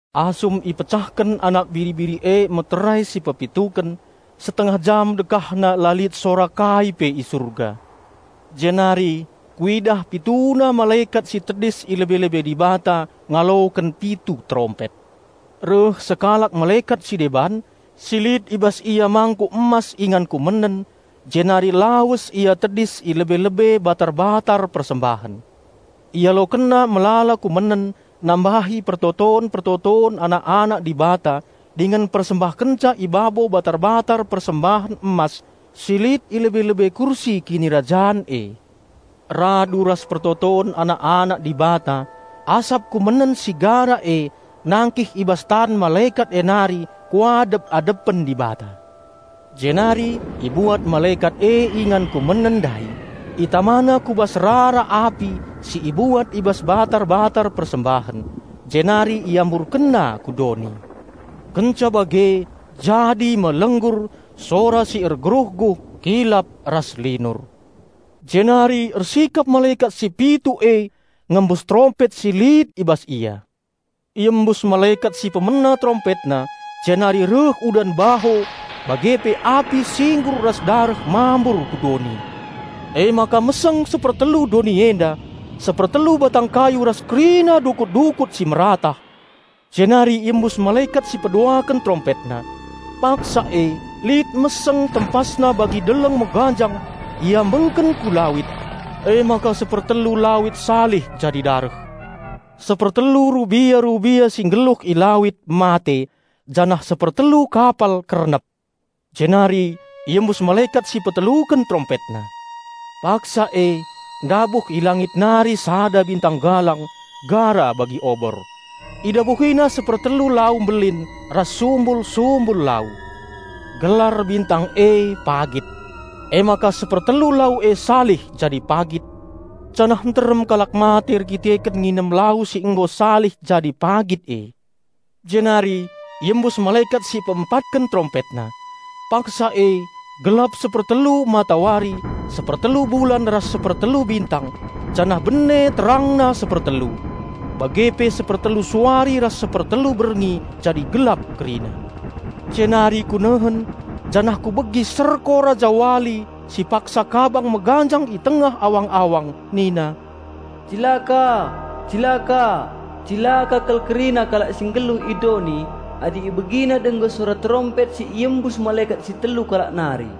Asum ipecahken Anak Biri-biri e meterai si pepituken, setengah jam dekahna la lit sora kai pe i Surga. Jenari kuidah pituna malekat si tedis i lebe-lebe Dibata ngaloken pitu terompet. Reh sekalak malekat si deban, si lit i bas ia mangkuk emas ingan kumenen, jenari lawes ia tedis i lebe-lebe batar-batar persembahen. Ialokenna melala kumenen nambahi pertoton-pertoton anak-anak Dibata dingen mpersembahkenca i babo batar-batar persembahen emas si lit i lebe-lebe kursi kinirajan e. Radu ras pertoton anak-anak Dibata, asap kumenen si gara e nangkih i bas tan malekat e nari kuadep-adepen Dibata. Jenari ibuat malekat e ingan kumenen ndai, itamana ku bas rara api si ibuat i bas batar-batar persembahen, jenari iamburkenna ku doni. Kenca bage jadi me lenggur, sora si ergeruhguh, kilap, ras linur. Jenari ersikap malekat si pitu e ngembus terompet si lit i bas ia. Iembus malekat si pemena terompetna jenari reh udan baho bage pe api singgur ras dareh mambur ku doni. Emaka meseng sepertelu doni enda, sepertelu batang kayu ras kerina dukut-dukut si meratah. Jenari iembus malekat si peduaken terompetna. Paksa e lit meseng tempasna bagi deleng meganjang, mbistak ku lawit. Emaka sepertelu lawit salih jadi dareh; sepertelu rubia-rubia si nggeluh i lawit mate, janah sepertelu kapal kernep. Jenari iembus malekat si peteluken terompetna. Paksa e ndabuh i langit nari sada bintang galang gara bagi obor. Idabuhina sepertelu lau mbelin ras sumbul-sumbul lau. (Gelar bintang e Pagit.) Emaka sepertelu lau e salih jadi pagit, janah nterem kalak mate erdandanken nginem lau si nggo salih jadi pagit e. Jenari iembus malekat si peempatken terompetna. Paksa e gelap sepertelu matawari, sepertelu bulan ras sepertelu bintang janah bene terangna sepertelu. Bage pe sepertelu suari ras sepertelu berngi jadi gelap kerina. Jenari kunehen, janah kubegi serko rajawali si paksa kabang meganjang i tengah awang-awang nina, "Cilaka! Cilaka! Cilaka kal kerina kalak si nggeluh i doni adi ibegina denggo sora terompet si iembus malekat si telu kalak nari!"